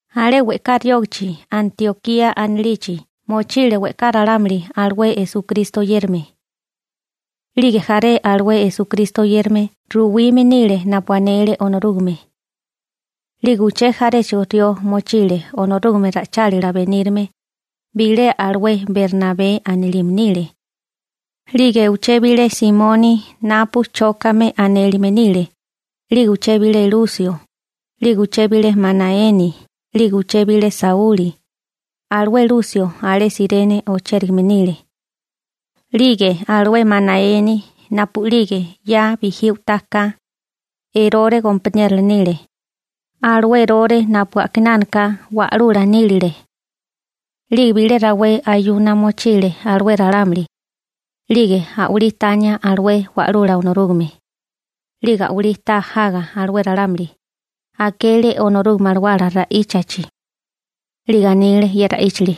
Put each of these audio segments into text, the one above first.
Alé we'ká riógichi Antiokía anilichi mochile we'ká ralámuli alué Esukristo oyérame. 'Lige jaré alué Esukristo oyérame ruwime nile napu anele Onorúgame. 'Lige uché jaréchigo rió mochile Onorúgame ra'ichálila benírame. Bilé alué Bernabé anilime nile, 'lige uché bilé Simoni napu Chókame anélime nile, 'lige uché bilé Lusio, 'lige uché bilé Manaeni, 'lige uché bilé Sauli. Alué Lusio alé Sirene ochérigame nile. 'Lige alué Manaeni napu'lige 'ya bijí u'taka, Erore gompaniérola nile, alué Erore napu a'kinánaka wa'lula nílile. 'Lige bilé rawé ayuna mochile alué ralámuli, 'lige a'walí tania alué Wa'lula Onorúgame. 'Lige a'walí ta jaga alué ralámuli, akele Onorúgame Alawala ra'íchachi. 'Lige anile ye ra'íchili: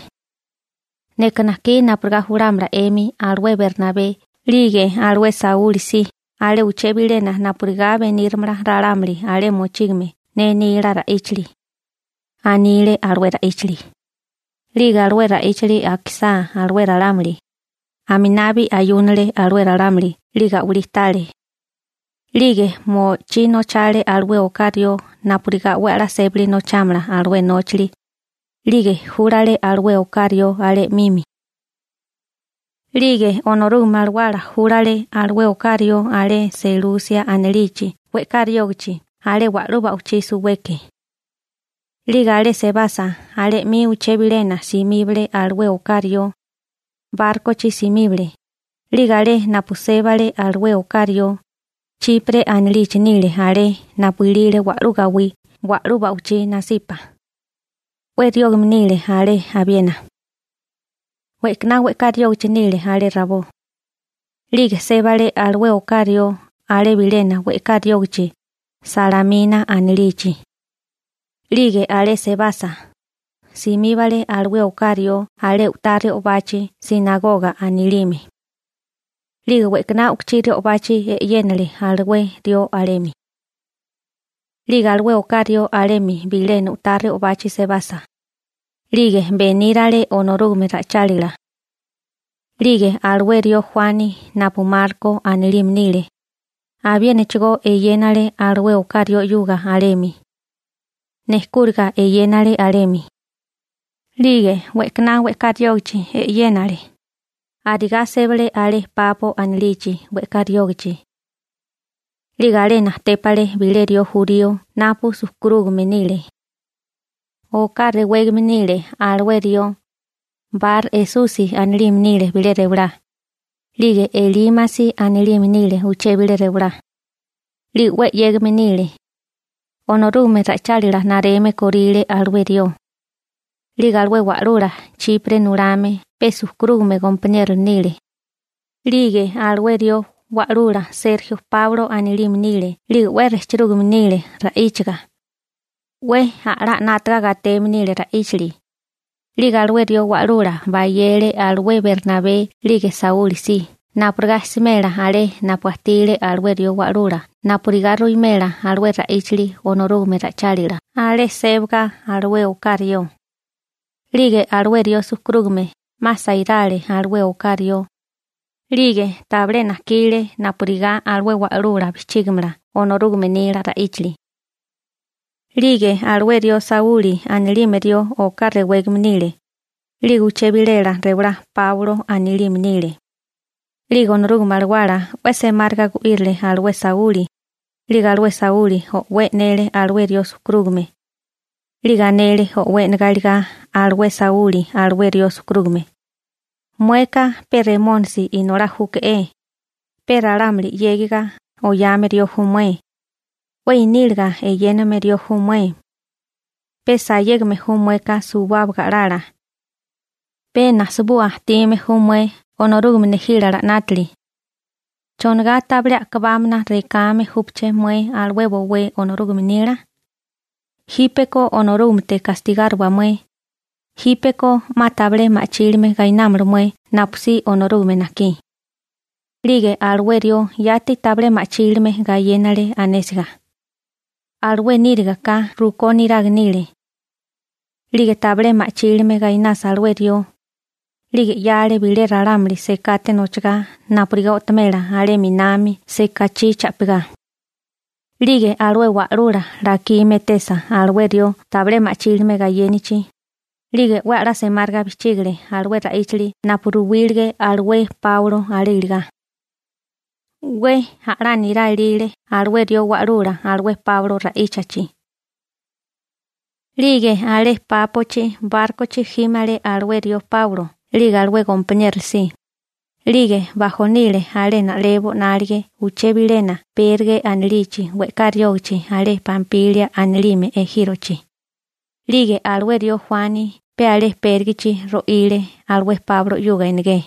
―Neka najkí napurigá julámala 'emi alué Bernabé 'lige alué Sauli si alé uché bilena napurigá beníramala ralámuli alé mochígame ne nila ra'íchali ―anile alué ra'íchili. 'Lige alué ra'íchili akisá alué ralámuli, aminabi ayúnale alué ralámuli 'lige a'walí tale. 'Lige mo'chí nochale alué oká rió napurigá 'we a'lá sébali nochámala alué nóchali, 'lige júlale alué oká rió alé 'mimi. 'Lige Onorúgame Alawala júlale alué oká rió alé Selusia anilichi we'ká riógichi alé wa'lú ba'wichí suweke. 'Lige alé sebasa alé 'mi uché bilena simíbale alué oká rió. Bárkochi simíbale. 'Lige alé napu sébale alué oká rió, Chipre anilichi nile alé napu ilile wa'lú gawí wa'lú ba'wichí nasipa. 'We riógame nile alé abiena. We'kaná we'ká riógichi nile alé rabó. 'Lige sébale alué oká rió alé bilena we'ká riógichi Salamina anilichi. 'Lige alé sebasa, simíbale alué oká rió alé u'tá re'obachi «sinagoga» anilime. 'Lige we'kaná u'kuchí re'obachi e'yénale alué rió alemi. 'Lige alué oká rió alemi bilena u'tá re'obachi sebasa, 'lige benírale Onorúgame ra'ichálila. 'Lige alué rió Juani napu Marko anilime nile, abiénachigó eyénale alué oká rió 'yuga alemi, nejkúriga eyénale alemi. 'Lige we'kaná we'ká riógichi e'yénale, arigá sébale alé Papo anilichi we'ká riógichi. 'Lige alé natépale bilé rió jurío napu sujkurúgame nile. Oká rewégame nile alué rió, Bar-Esusi anilime nile bilé rewalá, 'lige Elímasi anilime nile uché bilé rewalá. 'Lige 'we 'yégame nile, Onorúgame ra'ichálila nareme kóríle alué rió. 'Lige alué wa'lula Chipre nulame pe sujkurúgame gompaniérola nile. 'Lige alué rió wa'lula Serjio Páulo anilime nile 'lige 'we rejchirúgame nile ra'íchaga, 'we a'lá 'nátaga gateme nile ra'íchali. 'Lige alué rió wa'lula bayele alué Bernabé 'lige Sauli si napurigá smela alé napu ajtile alué rió wa'lula napurigá ruwimela alué ra'íchili Onorúgame ra'ichálila alé sébaga alué oká rió. 'Lige alué rió sujkurúgame 'ma sairale alué oká rió. 'Lige tabilé najkile napurigá alué wa'lula bijchígamala Onorúgame nila ra'íchali. 'Lige alué rió Sauli anilime rió oká rewégame nile, 'lige uché bilela rewalá Páulo anilime nile. 'Lige Onorúgame Alawala 'we semáriga gu'írile alué Sauli. 'Lige alué Sauli o'wé e'nele alué rió sujkurúgame. 'Lige anele o'wé e'negá iligá alué Sauli alué rió sujkurúgame: ―Mueka pe Remónisi inolá júke'é. Pe ralámuli 'yégiga oyame rió ju mué. 'We iníliga eyéname rió ju mué. Pe sayégame ju mueka suwábaga a'lala. Pe nasabua ajtime ju mué Onorúgame nejílala 'nátili. ¿Chonigá tabilé a'kabámana rekame júpaché mué alué bowé Onorúgame nila? Jípeko Onorúgamete gastigáriwa mué. Jípeko 'ma tabilé ma'chílime gainámala mué napusí Onorúgame najkí. 'Lige alué rió yati tabilé ma'chílime gayénale anésiga. Alué níriga ka rukó niraga nile. 'Lige tabilé ma'chílime gainasa alué rió, 'lige 'yale bilé ralámuli sekate nochagá napurigá o'tomela alé 'minami sekachí cha'pigá. 'Lige alué wa'lula lakime etesa alué rió tabilé ma'chílime gayénichi, 'lige 'we a'lá semáriga bijchígale alué ra'íchali napu ruwílige alué Páulo alé iligá. 'We a'lá nirá ilile alué rió wa'lula alué Páulo ra'íchachi. 'Lige alé Pápochi bárkochi jímale alué rió Páulo (Sauli) 'lige alué gompaniérola si, 'lige bajonile alé na'lebo 'nálige uché bilena Perge anilichi we'ká riógichi alé Pampilia anilime ejírochi. 'Lige alué rió Juani pe alé Pérgechi ro'ile alué Páulo 'yuga enegé,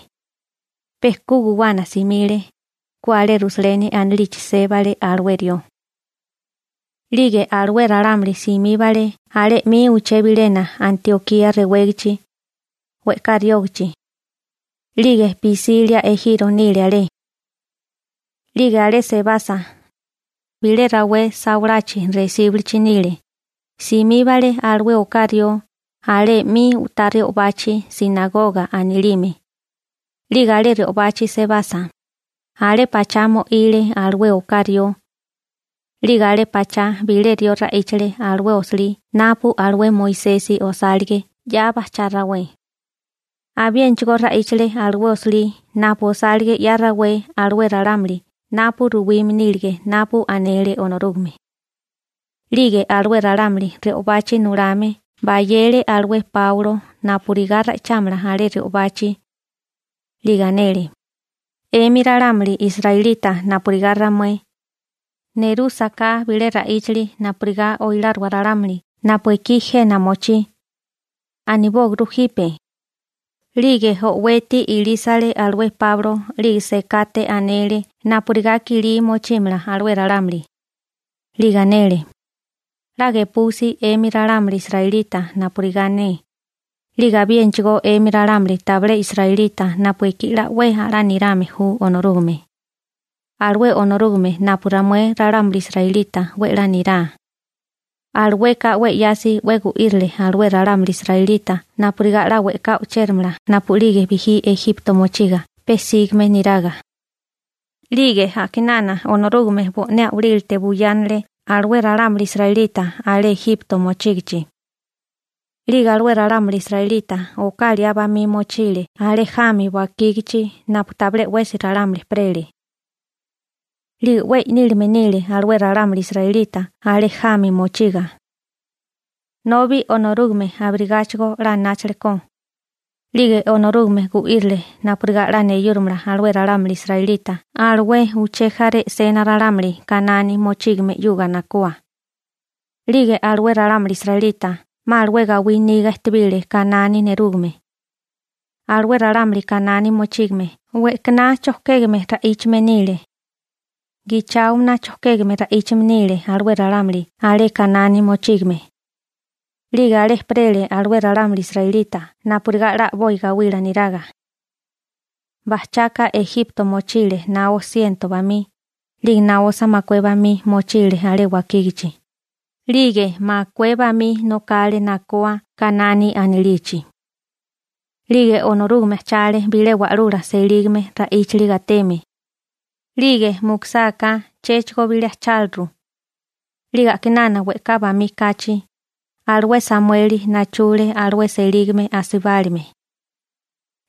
pe ku guwana simile, ku alé Rusaleni anilichi sébale alué rió. 'Lige alué ralámuli simíbale alé 'mi uché bilena Antiokía rewégichi we'ká riógachi. 'Lige Pisilia ejiro nile alé. 'Lige alé sebasa, bilé rawé sawalachi resíbulichi nile, simíbale alué oká rió alé 'mi u'tá re'obachi «sinagoga» anilime. 'Lige alé re'obachi sebasa, alé pachá mo'ile alué oká rió. 'Lige alé pachá bilé rió ra'íchale alué osilí napu alué Moisesi osálige 'ya bajchá rawé. Abiénachigó ra'íchale alué osilí napu osálige 'ya rawé alué ralámuli napu ruwime nílige napu anele Onorúgame. 'Lige alué ralámuli re'obachi nulame bayele alué Páulo napurigá ra'ichámala alé re'obachi. 'Lige anele: ―'Emi ralámuli israelita napurigá ramué, nerúsaká bilé ra'íchali napurigá oiláriwa ralámuli napu ekí jena mochí, anibóaguru jipe. 'Lige o'weti ilísale alué Páulo 'lige sekate anele napurigá kilí mochímala alué ralámuli. 'Lige anele: ―'La gepusi 'emi ralámuli israelita napurigá ne, 'lige abiénachigó 'emi ralámuli tabilé israelita napu ekí 'la 'we a'lá nirame ju Onorúgame. Alué Onorúgame napu ramué ralámuli israelita 'we 'la nirá, alueka 'we 'yasi 'we gu'írile alué ralámuli israelita napurigá 'la we'ká o'chéramala napu'lige bijí Ejipto mochiga pe sígame niraga. 'Lige a'kinana Onorúgame bo'né a'walílate buyánale alué ralámuli israelita alé Ejipto mochígichi. 'Lige alué ralámuli israelita oká liá bamí mochile alé jami wakígachi napu tabilé 'wesi ralámuli ejperele. 'Lige 'we i'nílime nile alué ralámuli israelita alé jami mochiga, nobi Onorúgame abirigáchigo 'la anáchale ko. 'Lige Onorúgame gu'írile napurigá 'la neyúrimala alué ralámuli israelita alué uché jaré e'sena ralámuli Kanani mochígame 'yuga nakoa. 'Lige alué ralámuli israelita 'ma alué gawí niga ejtebile Kanani nerúgame. Alué ralámuli Kanani mochígame we'kaná chojkégame ra'íchame nile, gicháomana chojkégame ra'íchame nile alué ralámuli alé Kanani mochígame. 'Lige alé ejperele alué ralámuli israelita napurigá 'la a'boi gawila niraga. Bajchaka Ejipto mochile naó siento bamí, 'lige naosa makué bamí mochile alé wakígachi, 'lige makué bamí nokale nakoa Kanani anilichi. 'Lige Onorúgame ajchale bilé wa'lula selígame ra'íchali gateme, 'lige mukusáká chéchigo bilé ajcháliru. 'Lige a'kinana we'ká bamí kachi, alué Samueli nachule alué selígame asibálime.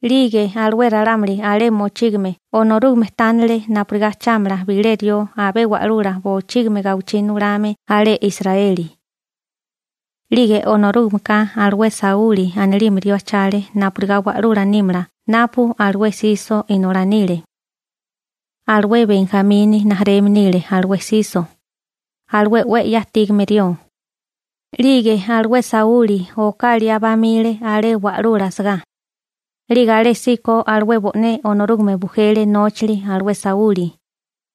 'Lige alué ralámuli alé mochígame Onorúgame tánele napurigá ajchámala bilé rió abé wa'lula bochígimi gawichí nulame alé Israeli. 'Lige Onorúgameka alué Sauli anilime rió ajchale napurigá wa'lula nímala napu alué Siso inolá nile. Alué Benjamini rijimala nile alué Siso, alué 'we 'ya ajtígame rió. 'Lige alué Sauli oká liá bamile alé wa'lula asagá. 'Lige alésíko alué bo'né Onorúgame bujele nóchili alué Sauli.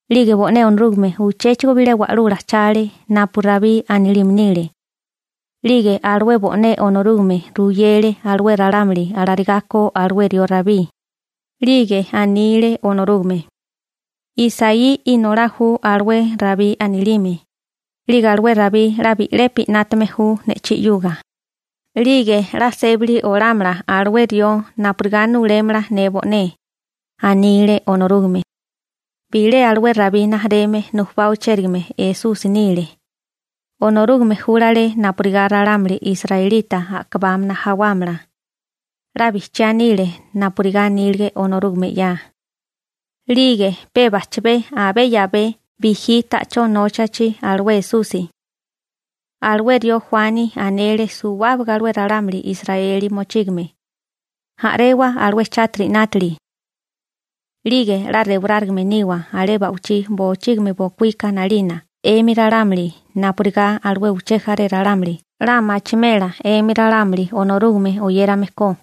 'Lige bo'né Onorúgame uchéchigo bilé wa'lula ajchale napu Rabí anilime nile. 'Lige alué bo'né Onorúgame ruyele alué ralámuli alarigá ko alué rió Rabí. 'Lige anile Onorúgame: «Isaí inolá ju alué Rabí anilime. 'Lige alué Rabí 'la bi'lepi 'nátame ju ne'chí 'yuga. 'Lige 'la sébali olámala alué rió napurigá nulémala ne bo'né», anile Onorúgame. Bilé alué Rabí rijimala nujubá ochérigame Esusi nile. Onorúgame júlale napurigá ralámuli israelita a'kabámana jawámala. 'La bijchiá nile napurigá anílige Onorúgame 'ya. 'Lige pe bajchabé abé 'yabé bijí ta'chó nóchachi alué Esusi, alué rió Juani anele suwábaga alué ralámuli Israeli mochígame: «A'rewa alué chátiri 'nátili, 'lige 'la rewarárigame niwa alé ba'wichí bochígimi bokuíka 'nalina 'emi ralámuli napurigá alué uché jaré ralámuli 'la machimela 'emi ralámuli Onorúgame oyérame ko.»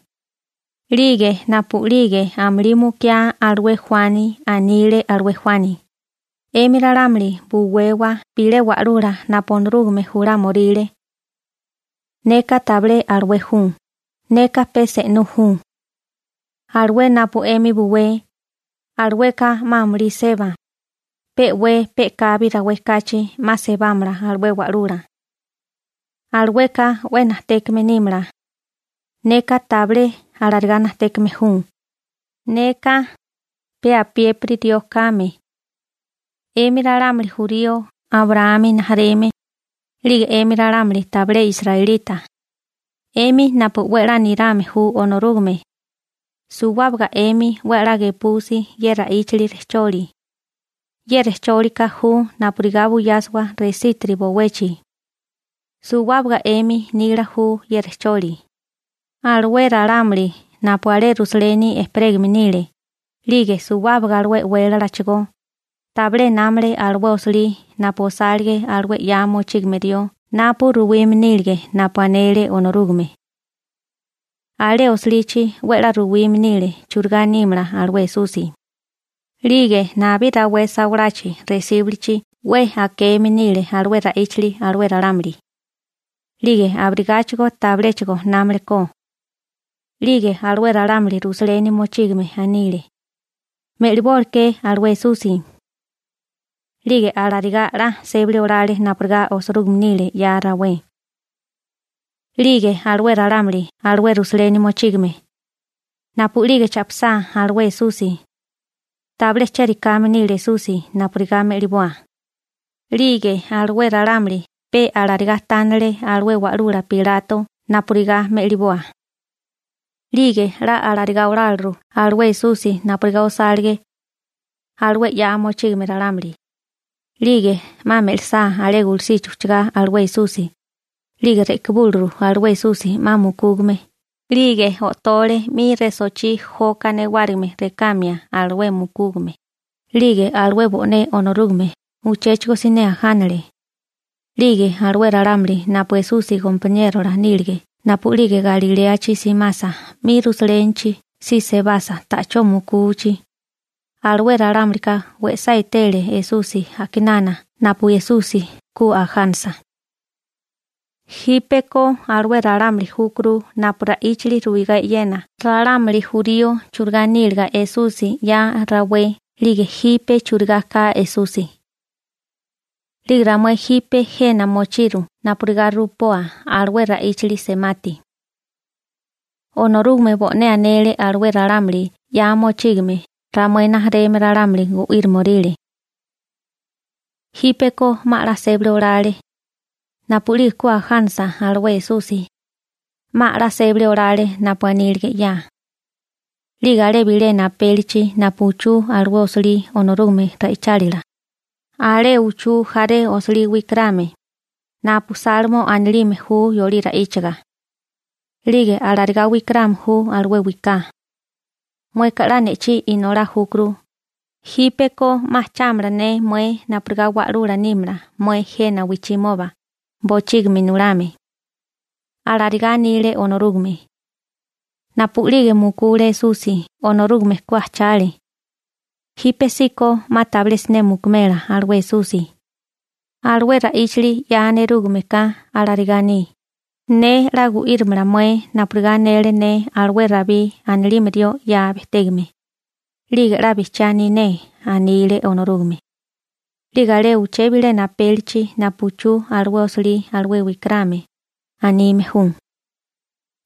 'Lige napu'lige amulí mukiá alué Juani, anile alué Juani: «'Emi ralámuli buwewa bilé wa'lula napu Onorúgame julámioríle. Neka tabilé alué ju, neka pe se'nú ju. Alué napu 'emi buwé, alueka 'ma amulí seba, pe'wé pe'kabi rawé kachi 'ma sebámala alué wa'lula. Alueka 'we najtékame nímala. Neka tabilé alarigá najtékame ju, neka pe apiépiri rió kame.» › 'Emi ralámuli jurío Abraámi rijimala, 'lige 'emi ralámuli tabilé israelita, 'emi napu 'we a'lá nirame ju Onorúgame, suwábaga 'emi 'we a'lá gepusi ye ra'íchili rejcholi. Ye rejchólika ju napurigá buyásiwa resítiri bowechi. Suwábaga 'emi nila ju ye rejcholi. Alué ralámuli napu alé Rusaleni ejperégame nile, 'lige suwábaga alué e'wélalachigó, tabilé námale alué osilí alué napu osálige alué 'ya mochígame rió napu ruwime nílige napu anele Onorúgame. Alé osilichi 'we 'la ruwime nile churigá nímala alué Esusi. 'Lige nabí rawé sawalachi resíbulichi 'we akeme nile alué ra'íchali alué ralámuli. 'Lige abirigáchigo tabiléchigo námale ko. 'Lige alué ralámuli Rusaleni mochígame anile: «Me'libóleké alué Esusi.» 'Lige alarigá 'la sébali olale napurigá osirúgime nile 'ya rawé. 'Lige alué ralámuli alué Rusaleni mochígame, napu'lige cha'pisá alué Esusi, tabilé chérikáme nile Esusi napurigá me'liboa. 'Lige alué ralámuli pe alarigá tánale alué wa'lula Pilato napurigá me'liboa. 'Lige 'la alarigá oláliru alué Esusi napurigá osálige alué 'ya mochígame ralámuli, 'lige 'ma me'lisá alé gulusichi ujchagá alué Esusi, 'lige re'kibúliru alué Esusi 'ma mukúgame, 'lige o'tole 'mi resochí joka newárigime rekamia alué mukúgame. 'Lige alué bo'né Onorúgame uchéchigo siné ajánale. 'Lige alué ralámuli napu Esusi gompaniérola nílige napu'lige Galiléachi simasa 'mi Rusalénichi si sebasa ta'chó mukuchi, alué ralámulika we'sá etele Esusi a'kinana napu Esusi ku ajánasa. Jípeko alué ralámuli júkuru napu ra'íchali ruigá e'yena ralámuli jurío churigá níliga Esusi 'ya rawé 'lige jipe churigá ka Esusi. › 'Lige ramué jipe jena mochiru napurigá rupoa alué ra'íchili semati. Onorúgame bo'né anele alué ralámuli 'ya mochígame ramué rijimala ralámuli gu'írimoríle. Jípeko 'ma a'lá sébali olale. Napu'lige ku ajánisa alué Esusi, 'ma a'lá sébali olale napu anílige 'ya. 'Lige alé bilena apélichi napu uchú alué osilí Onorúgame ra'ichálila, alé uchú jaré osilí wikarame (napu Salmo anilime ju yolí ra'íchaga), 'lige alarigá wikarame ju alué wiká: «Mueka 'la ne'chí inolá júkuru, jípeko 'ma ajchámala ne mué napurigá wa'lula nímala mué jena wijchimoba bochígimi nulame.» Alarigá anile Onorúgame. Napu'lige mukule Esusi Onorúgame ku ajchale, jípesíko 'ma tabilé siné mukumela alué Esusi. Alué ra'íchali 'ya nerúgame ka alarigá aní: «Ne 'la gu'írimala mué napurigá anele ne alué Rabí anilime rió 'ya bejtégame. 'Lige 'la bijchiá aní ne», anile Onorúgame.» 'Lige alé uché bilena apélichi napu uchú alué osilí alué wikarame, anime ju: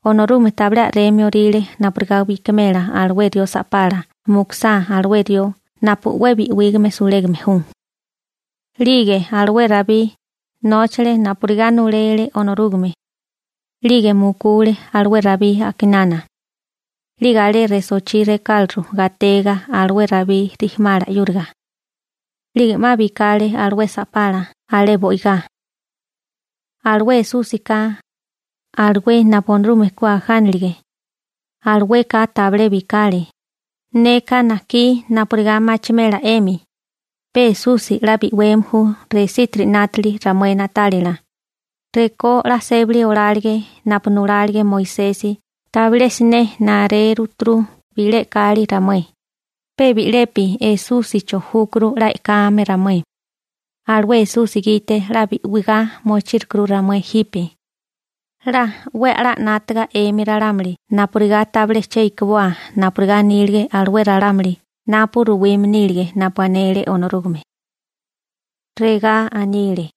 «Onorúgame tabilé a'remio orile napurigá bikimela alué rió sa'pala mukusá alué rió napu 'we bi'wígame sulégame ju.» 'Lige alué Rabí nóchale napurigá nulele Onorúgame. 'Lige mukule alué Rabí a'kinana. 'Lige alé resochí rekáliru gatega alué Rabí rijimálala 'yúriga. 'Lige 'ma bikale alué sa'pala alé bo'igá. Alué Esúsika, alué napu Onorúgame ku ajánilige, alueka tabilé bikale. Neka najkí napurigá machimela 'emi, pe Esusi 'la bi'weme ju resítiri 'nátali ramué na'tálila. Rekó 'la sébali olálige napu nulálige Moisesi tabilé siné naréruturu bilé e'kali ramué. Pe bi'lepi Esúsicho júkuru 'la e'kame ramué. Alué Esusi gite 'la bi'wigá mochírukuru ramué jipe. 'La 'we a'lá 'nátaga 'emi ralámuli napurigá tabilé che ikiboa napurigá anílige alué ralámuli napu ruwime nílige napu anele Onorúgame. Regá anile: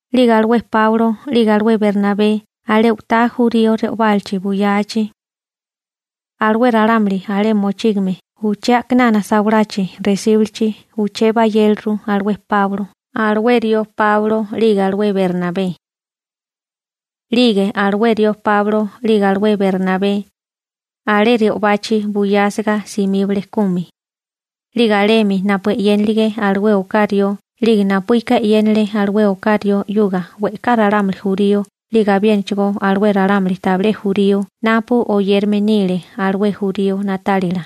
'Lige alué Páulo 'lige alué Bernabé alé u'tá jurío re'obálachi buyachi, alué ralámuli alé mochígame uché a'kinana sawalachi resíbulichi uché bayéliru alué rió Páulo 'lige alué Bernabé. 'Lige alué rió Páulo 'lige alué Bernabé, alé re'obachi buyásiga simíbale kumi. 'Lige alemi napu e'yénilige alué oká rió 'lige napuíka e'yénale alué oká rió 'yuga we'ká ralámuli jurío 'lige abiénachigó alué ralámuli tabilé jurío napu oyérame nile alué jurío na'tálila.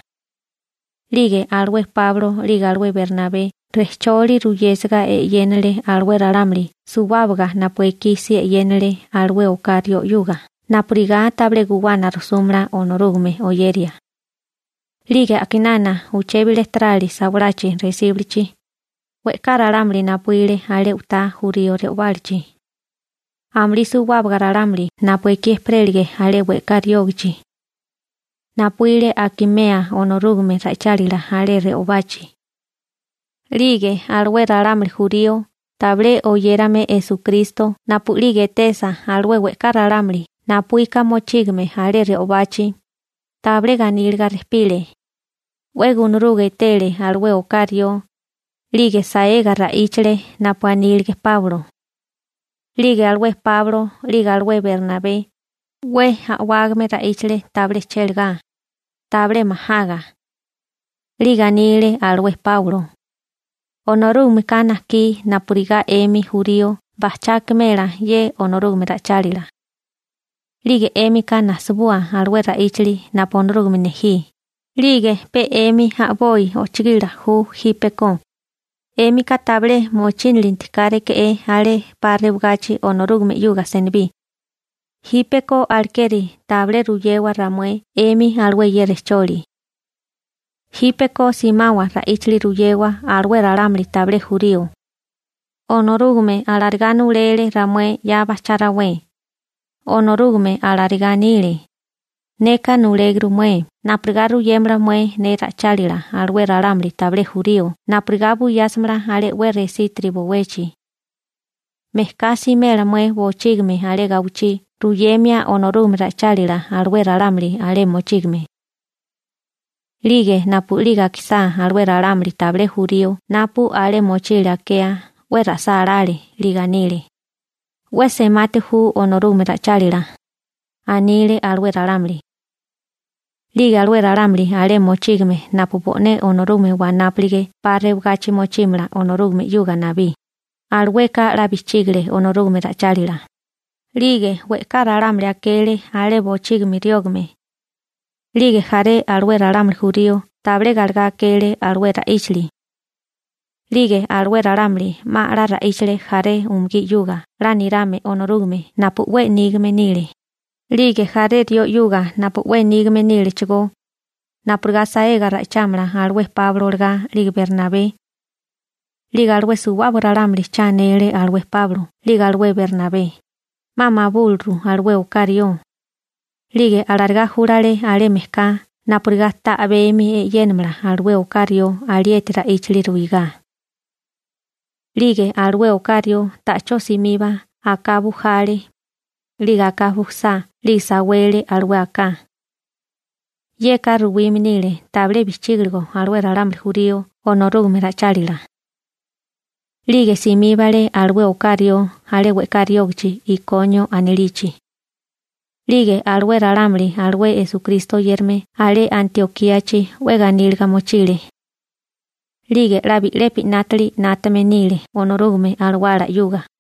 'Lige alué Páulo 'lige alué Bernabé rejcholi ruyésiga e'yénale alué ralámuli suwábaga napu ekí si e'yénale alué oká rió 'yuga napurigá tabilé guwana rujsúmala Onorúgame oyeria. 'Lige a'kinana uché bilé tarali sawalachi resíbulichi, we'ká ralámuli napuíle alé u'tá jurío re'obálachi. Amulí suwábaga ralámuli napu ekí ejperélige alé we'ká riógichi napuíle akimea Onorúgame ra'ichálila alé re'obachi. 'Lige alué ralámuli jurío tabilé oyérame Esukristo napu'lige etesa alué we'ká ralámuli napuíka mochígame alé re'obachi, tabilé ganíliga rejpile, 'we gunaruga etele alué oká rió, 'lige saega ra'íchale napu anílige Páulo. 'Lige alué Páulo 'lige alué Bernabé, 'we a'wágame ra'íchale tabilé chéligá, tabilé majaga. 'Lige anile alué Páulo: ―Onorúgameka najkí napurigá 'emi jurío bajchá akimela ye Onorúgame ra'ichálila. 'Lige 'émika nasibua alué ra'íchali napu Onorúgame nejí. 'Lige pe 'emi a'boi ojchigila ju jípeko. 'Émika tabilé mochínilinti káréke'é alé 'pa rewagachi Onorúgame 'yuga senibí. Jípeko alekeri tabilé ruyewa ramué 'emi alué ye rejcholi. Jípeko simawa ra'íchali ruyewa alué ralámuli tabilé jurío. Onorúgame alarigá nulele ramué 'ya bajchá rawé. Onorúgame alarigá anile: Neka nuléguru mué napurigá ruyémala mué ne ra'ichálila alué ralámuli tabilé jurío napurigá buyásimala alé 'we resítiri bowechi. Mejká simela mué bochígimi alé gawichí ruyemia Onorúgame ra'ichálila alué ralámuli alé mochígame. 'Lige napu'lige akisá alué ralámuli tabilé jurío napu alé mochile akea, 'we ra'sálále. 'Lige anile: ―'We semati ju Onorúgame ra'ichálila ―anile alué ralámuli. 'Lige alué ralámuli alé mochígame napu bo'né Onorúgame wanápulige 'pa rewagachi mochímala Onorúgame 'yuga nabí, alueka 'la bijchígale Onorúgame ra'ichálila. 'Lige we'ká ralámuli akele alé bochígimi riógame. 'Lige jaré alué ralámuli jurío tabilé galegá akele alué ra'íchali. 'Lige alué ralámuli 'ma a'lá ra'íchale jaré umugí 'yuga 'la nirame Onorúgame napu 'we nígame nile, 'lige jaré rió 'yuga napu 'we nígame nílechigó, napurigá saega ra'ichámala alué Páulo olagá 'lige Bernabé. 'Lige alué suwábaga ralámuli cha anele alué Páulo 'lige alué Bernabé, 'ma mabúliru alué oká rió. 'Lige arigá júlale alé mejká napurigá ta a'bemi e'yénamala alué oká rió alieti ra'íchali ruigá. 'Lige alué oká rió ta'chó simiba aká bujale, 'lige aká bujasá 'lige sawele alué aká. Yeka ruwime nile tabilé bijchígiligo alué ralámuli jurío Onorúgame ra'ichálila. 'Lige simíbale alué oká rió alé we'ká riógichi Ikonio anilichi. 'Lige alué ralámuli alué Esukristo oyérame alé Antiokíachi 'we ganíliga mochile. 'Lige 'la bi'lepi 'nátali 'nátame nile Onorúgame Alawala 'yuga.